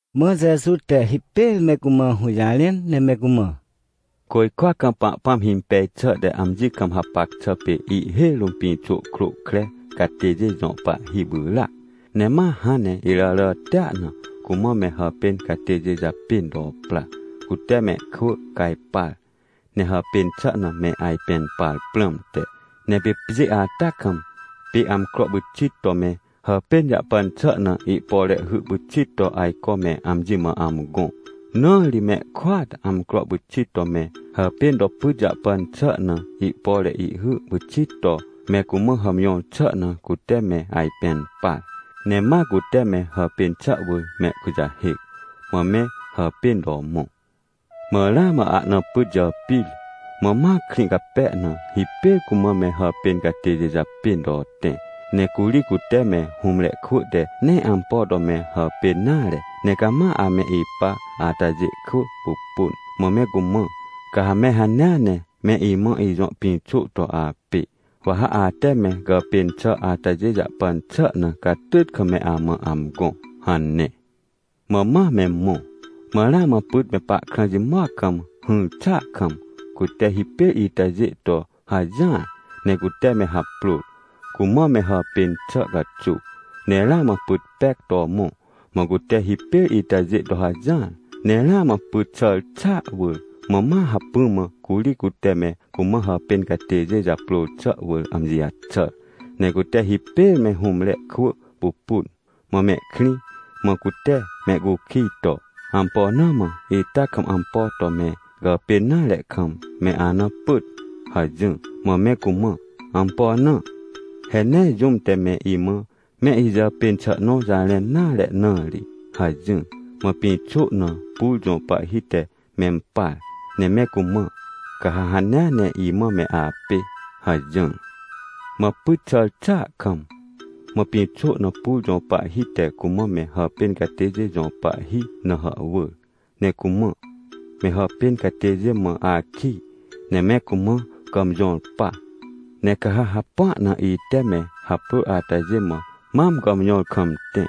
Mã Jeju te hipêr me cumã hũjarẽn ne me cumã: — Côjkwa kam Pahpãm himpej xà te amji kam hapac xà pê ihhêj rũm pĩxô krô kre catêjê jõ pahhi pyràac. Ne ma hãn ne iràràtia na, cumã me hàpên catêjê japên to pra, cute mehkwỳ cajpar, ne hàpên xà na me ajpẽn par prãmte. Ne pê pjê ata kam, pê amcro pyxit to me hàpên jahpan xà na ihpore hy pyxit to ajco me amji mã amgõ. Na ri mehkôat amcro pyxit to me hàpên to pyt jahpan xà na ihpore ihhy pyxit to me cumã hàmjõr xà na cute me ajpẽn par. Ne ma cute me hàpên xà wỳr mehkujahêc, mã me hàpên to mõ. — Mã ramã ahna pyt jàpir, mã ma krĩ cape na hipêr cumã me hàpên catêjê japên to tẽ. Ne curi cute me hũmre kwỳ te nee ampo to me hàpên nare, ne cama ame ipa atajê kwỳ pupun. Mã me cumã: “Ca ha me hanea ne me imã ijõ pĩxô to apê, wa ha ate me gàpên xà atajê jahpan xà na catyt kam me amã amgõ” hane. Mã ma me mõ. — Mã ramã pyt me pahkrã jimoc kam hỹr xàa kam, cute hipêr itajê to hajỹar, ne cute me haprôr, cumã me hàpên xà caxuw. Ne ramã pyt pec to mõ, mã cute hipêr itajê to hajỹar. Ne ramã pyt xàr xàa wỳr, mã ma hacpỹ mã curi cute me cumã hàpên catêjê japrôr xà wỳr amji jaxàr. Ne cute hipêr me hũmre kwỳ pupun, mã mehkrĩ, mã cute mehcukij to: “Ampo na mã ita kam ampo to me gàpên nare kam, me ana pyt?” hajỹr. — Mã me cumã: “Ampo na? He nee jũm te me imã me ijàpên xà nõ jarẽn nare na ri” hajỹr. Mã pĩxô na pur jõ pahhi te mempar ne me cumã: “Ca ha hanea ne imã me apê” hajỹr. — Mã pyt xàr xàa kam, mã pĩxô na pur jõ pahhi te cumã me hàpên catêjê jõ pahhi na hàhwỳr ne cumã: “Me hàpên catêjê mã akij, ne me cumã gàmjõr pa. Ne ca ha hapua na ite me haprôr atajê mã mam gàmjõr kam tẽ,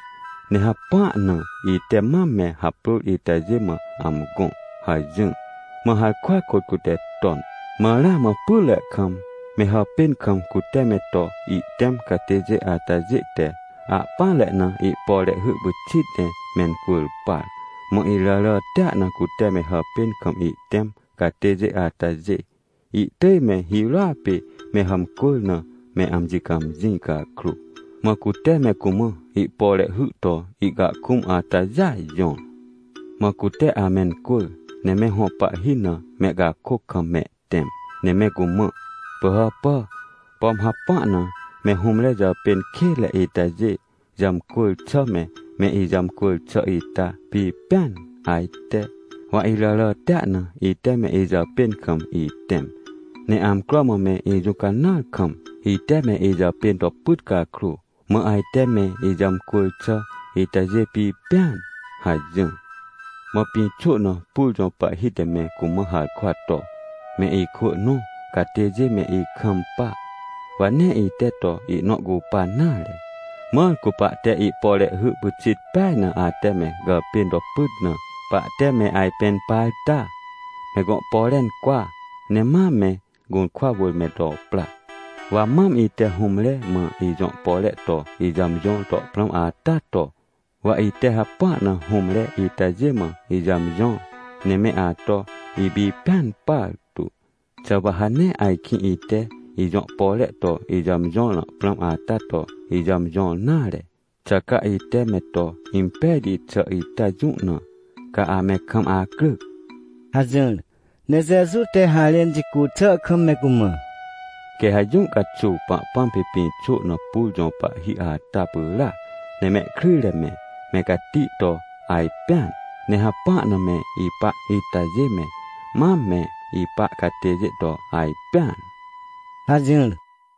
ne hapua na ite mam me haprôr itajê mã amgõ” hajỹr. Mã harkwa kôt cute ton. — Mã ramã pytre kam, me hàpên kam cute me to ihtẽm catêjê atajê te ahpỹanre na ihpore ihhy pyxit ne mencwỳr par. Mã iràràtia na cute me hàpên kam ihtẽm catêjê atajê, ihtỳj me hirôa pê me hàmcwỳr na me amji cãmjĩ cakrô, mã cute me cumã ihpore ihhy to ihcahkũm atajêa jõr. Mã cute amencwỳr, ne me hõ pahhi na mehcakôc kam mehtẽm. Ne me cumã: “Pỳhàpà! Pom hapua na me hũmre jàpên kênre itajê jàmcwỳr xà me, me ijàmcwỳr xà ita pipẽan ajte? Wa iràràtia na ite me ijàpên kam itẽm. Ne amcro mã me ijũcanãar kam, ite me ijàpên to pyt cakrô, mã ajte me ijàmcwỳr xà itajê pipẽan!” hajỹr. — Mã pĩxô na pur jõ pahhi te me cumã harkwa to: “Me ikwỳ nõ catêjê me ikampa, wa nee ite to ihnõ cupan nare. Mãr cu pahte ihpore hy pyxit peaj na ate me gàpên to pyt na, pahte me ajpẽn par ta? Me gõ pore incwa, ne ma me gũrkwa wỳr me to pra. Wa mam ite hũmre mã ijõ pore to ijàmjõr to prãm ata to, wa ite hapua na hũmre itajê mã ijàmjõr, ne me ato ipipẽn partu. Xà wa ha nee ajkĩ ite ijõ pore to ijàmjõr na prãm ata to ijàmjõr nare? Xà ca ite me to impejti xà ita jũ na, ca ame kam acryc?” — hajỹr. Ne Jeju te harẽn jicu xà kam me cumã: — Quê ha jũ caxuw Pahpãm pê pĩxô na pur jõ pahhi ata pyràac. Ne mehkryjre me, me cati to ajpẽan. Ne hapua na me ipa itajê me, mam me ipa catêjê to ajpẽan — hajỹr.